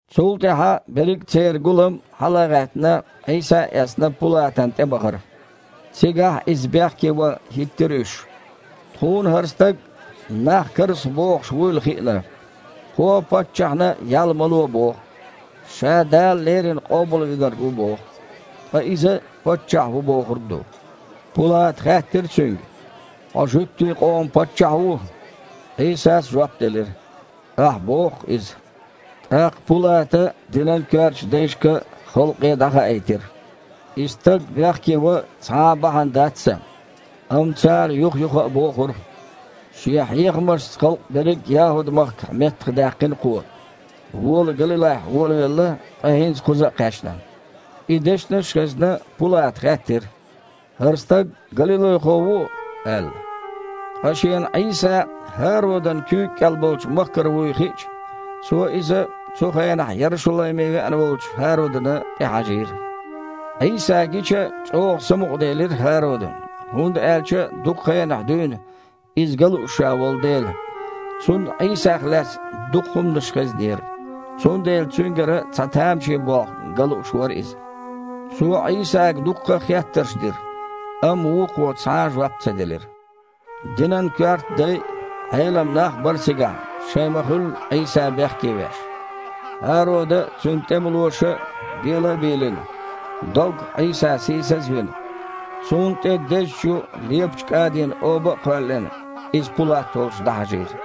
Цул тІаьхьа берриг а церан гулам, хьала а гІаьттина, Іийса а эцна, Пулатана тІе бахара. Цигахь Иза бехке ван хІиттира уьш: «Тхуна хІара стаг нах карзахбохуш вуьйла хиъна. Кхо паччахьна ял ма ло боху, Ша Дала Леррина Къобалвинарг ву боху, ткъа иза паччахь ву бохург ду». Пулата хаьттира Цуьнга: «Хьо жуьгтийн къоман Паччахь ву?» Іийсас жоп делира: «Ахь а боху-кх иза». ТІаккха Пулата динан коьртачу дайшка а, халкъе а дІахаийтира: «И стаг бехке ван цхьа а бахьана дац сан». Амма цара юх-юха а бохура: «Шен хьехамашца халкъ берриг а ЯхІуд-махкахь меттахдаьккхина Кхо. Вола Галилайхь волавелла, ткъа хІинца кхуза а кхаьчна». И дешнаш а хезна, Пулата хаьттира: «ХІара стаг галилайхо ву?» – аьлла. Ткъа шена Іийса ХІародан куьйга кІел болчу махкара вуй хиъча, цо Иза цу хенахь Ярушалайме веана волчу ХІародана тІе хьажийра. Іийса гича, чІогІа самукъаделира ХІародан, хІунда аьлча дукха хенахь дуьйна Иза ган лууш ша волу дела. Цунна Іийсах лаьцна дукха хІуманаш хезнера, цундела Цуьнгара цхьа тамашийна болх ган лууш вара иза. Цо Іийсага дуккха а хеттарш дира, амма Вукхо цхьа а жоп ца делира. Динан коьрта дай а, Іелам нах а бара цигахь, шайн ма-хуьллу Іийса бехке веш. ХІарода а, цуьнан тІемалоша а, бела а бийлина, доггах Іийса сийсаз а вина, Цунна тІе дезачу, лепачу кІадин оба а кхоьллина, Иза Пулат волчу дІахьажийра.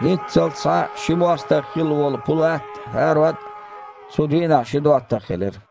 ХІинццалц схьа ши мостагІа хилла волу Пулат а, ХІарод а цу дийнахь ши доттагІа хилира.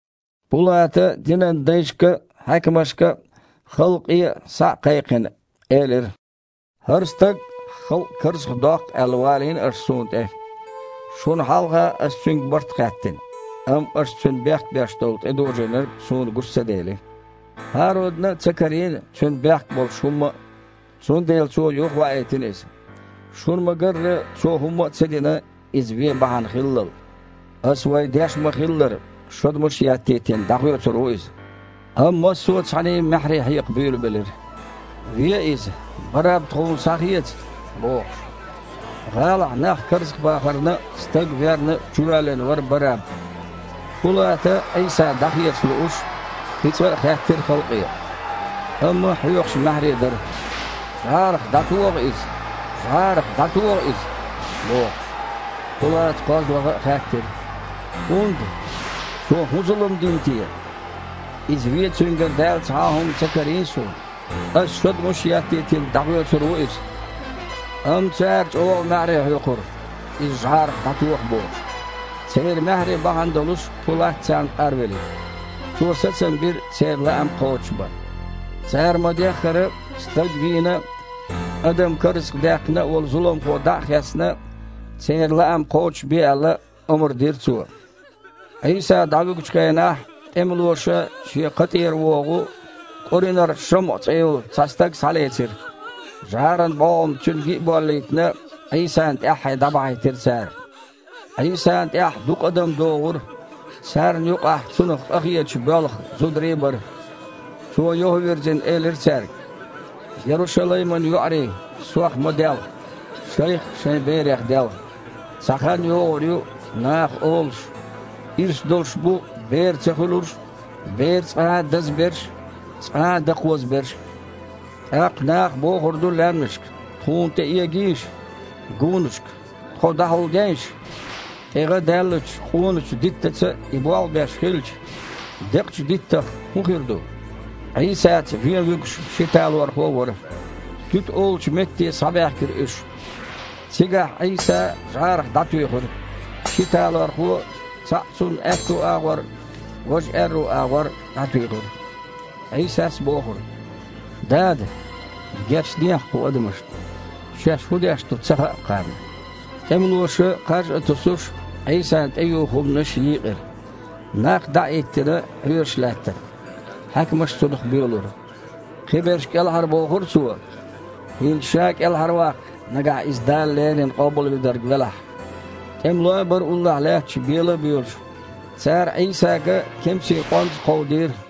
Пулата динан дайшка а, хьаькамашка а, халкъе а, схьа а кхайкхина, элира: «ХІара стаг, халкъ карзахдоккху аьлла, валийна аш суна тІе. Шуна хьалха ас Цуьнга барт хаьттина, амма аш Цуьнан бехк беш тІедожийнарг суна гучу ца дели. ХІародана а ца карийна Цуьнан бехк болуш хІумма а, цундела цо юхаваийтина Иза. Шуна ма-гарра, Цо хІумма ца дина Иза вен бахьана хиллал. Ас, вай деш ма-хиллара, шодмаш а еттийтина, дІахоьцур ву Иза». Амма массо а цхьаьний маьхьарий хьекха буьйлабелира: «Ве Иза! Барраб тхуна схьахеца!» – бохуш. (ГІалахь нах карзахбахарна а, стаг верна а чувоьллина вара Барраб.) Пулата, Іийса дІахеца лууш, кхин цкъа а хаьттира халкъе. Амма хьоькхуш маьхьарий дара: «ЖІарах дІатоха Иза! ЖІарах дІатоха Иза!» – бохуш. Пулата кхозлагІа а хаьттира: «ХІунда? Цо хІун зулам дина те? Иза вен Цуьнгара даьлла цхьа а хІума ца карийна суна. Ас шодмаш а еттийтина, дІахоьцур ву Иза!» Амма цара чІогІа маьхьарий хьоькхура, Иза жІарах дІатоха бохуш. Церан маьхьарий бахьана долуш, Пулат царна къарвелира. Цо сацам бира церан лаам кхочушбан. Цара ма-деххара, стаг вийна а, адам карзахдаьккхина а волу зуламхо дІа а хецна, церан лаам кхочушбе аьлла, омра дира цо. Іийса дІавуьгучу хенахь тІемалоша шен кха тІера вогІу Къуринара ШамІа цІе йолу цхьа стаг схьалецира. ЖІаран бІогІам цуьнга ги а боллийтина, Іийсана тІаьххье дІабахьийтира цара. Іийсана тІаьхьа дукха адам догІура, царна юкъахь Цунах къахеташ боьлху зударий а бара. Цо, юха а вирзина, элира цаьрга: «Ярушалайман йоІарий, Сох ма делха, шайх а, шайн берех а делха. Цхьа хан йогІур ю наха олуш: „Ирс долуш бу бер ца хуьлурш а, бер цкъа а даза берш а, цкъа а дакхоза берш а“. ТІаккха наха бохур ду лаьмнашка: „Тхуна тІе эгийша!“ гунашка: „Тхо дІахьулдейша!“ ТІе гІа даьллачу къоначу диттаца и болх беш хилча, декъачу диттах хІун хир ду?» Іийсаца вен вуьгуш ши талорхо а вара. «Туьта» олучу метте схьабаьхкира уьш. Цигахь Іийса жІарах дІатуьйхира, ши талорхо а – цхьаъ Цунна аьтту агІор, важа аьрру агІор дІатуьйхира. Іийсас бохура: «Дада, гечдехьа кху адамашна, шаьш хІун деш ду ца хаьа-кх кхарна». ТІемалоша, кхаж а тосуш, Іийсан тІеюху хІуманаш йийкъира. Нах, дІа а хІиттина, хьоьжуш лаьттара. Хьаькамаш Цунах боьлура: «Кхиберш кІелхьарбохура Цо! ХІинца Ша кІелхьарваккха, нагахь Иза Дала леррина Къобалвинарг велахь!» ТІемалой а бара уллохь лаьтташ, бела а боьлуш. Цара Іийсага кемсийн къонза кховдийра: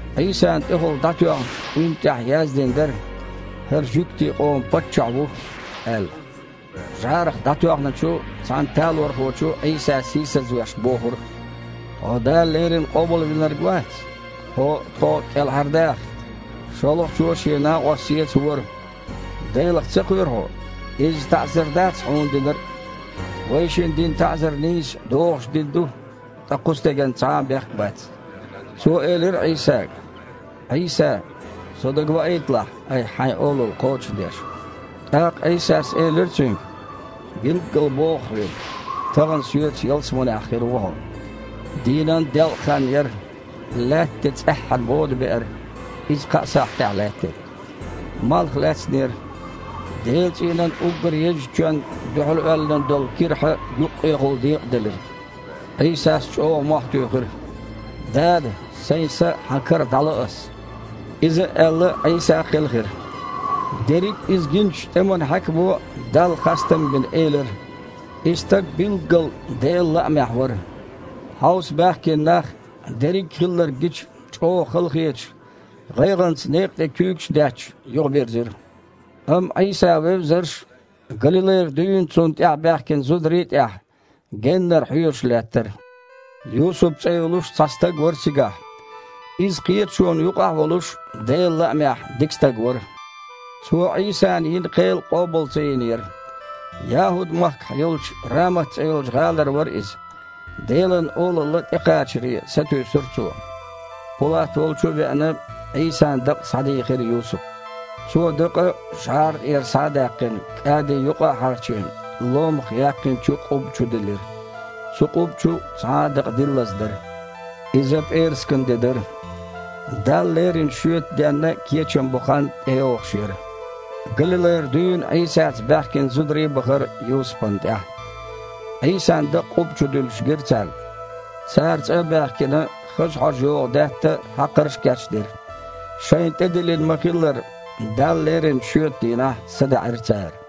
Іийсана тІехула дІатоьхначу уьнна тІехь яздина дара: «ХІара жуьгтийн къоман Паччахь ву», – аьлла. ЖІарах дІатоьхначу цхьана талорхочо Іийса сийсазвеш бохура: «Хьо Дала Леррина Къобалвинарг вац? Хьуо а, тхо а кІелхьардаха!» ШолгІачо шен накъост сецавора: «Делах ца кхоьру хьо? Изза таІзар дац хьуна динарг а? Вайшинна дина таІзар нийса, догІуш дина ду, ткъа кху стеган цхьа а бехк бац». Цо элира Іийсага: «Іийса, со дагаваийталахь, Айхьа Хьайн Олалла кхочушдеш». ТІаккха Іийсас элира цуьнга: «Билггала боху хьоьга: тахана Соьца ялсаманехь хир ву хьо». Дийнан делкъахан еара. Лаьтта тІе цІеххьана бода беара, иза кхаа сахьтехь лаьттира. Малх лаьцнера. Делан цІийнан уггар езачу чоьнна дуьхьал оьллина долу кирхьа юккъехула декъаделира. Іийсас чІогІа мохь туьйхира: «Дада! Сайн са Хьан кара дІало Ас!» Иза а аьлла, Іийса кхелхира. Дерриг иза гиначу тІеман хьаькамо, Далла хастам а бина, элира: «И стаг билггала Делан лаамехь вара!» Хьовса баьхкина нах, дерриг а хилларг гича, чІогІа халахеташ, гІайгІанца некха тІе куьйгаш а детташ, юхабирзира. Амма Іийса вевзарш, Галилайра дуьйна Цунна тІаьхьа баьхкина зударий а тІехь, геннара хьоьжуш лаьттара. Юсуп цІе йолуш цхьа стаг вара цигахь. Иза кхеташона юкъахь а волуш, Делан лаамехь, дика стаг вара. Цо Іийсана йина кхел къобал ца йинера. ЯхІуд-махкахь йолчу Рамат цІе йолчу гІалара вара иза. Делан Олалла тІекхачаре сатуьйсура цо. Пулат волчу а веана, Іийсан дакъа схьадийхира Юсупа. Цо дакъа, жІара тІера схьа а даьккхина, кІади юкъа а хьарчийна, ломах яьккхинчу къубба чу диллира. Цу къубба чу цхьа а дакъа диллаза дара. Иза пІераскан де дара – Далла лерина шоьтан денна кечам бо хан тІейогІуш яра. Галилайра дуьйна Іийсаца баьхкина зударий а бахара Юсупна тІаьхьа. Іийсан дакъа къубба чу дуьллуш гира царна. Цара, цІа а баьхкина, хаза хьожа йогІу даьтта а, хьакхарш а кечдира. Шайна тІедиллина ма-хиллара, Далла леринчу шоьтан дийнахь садаьІира цара.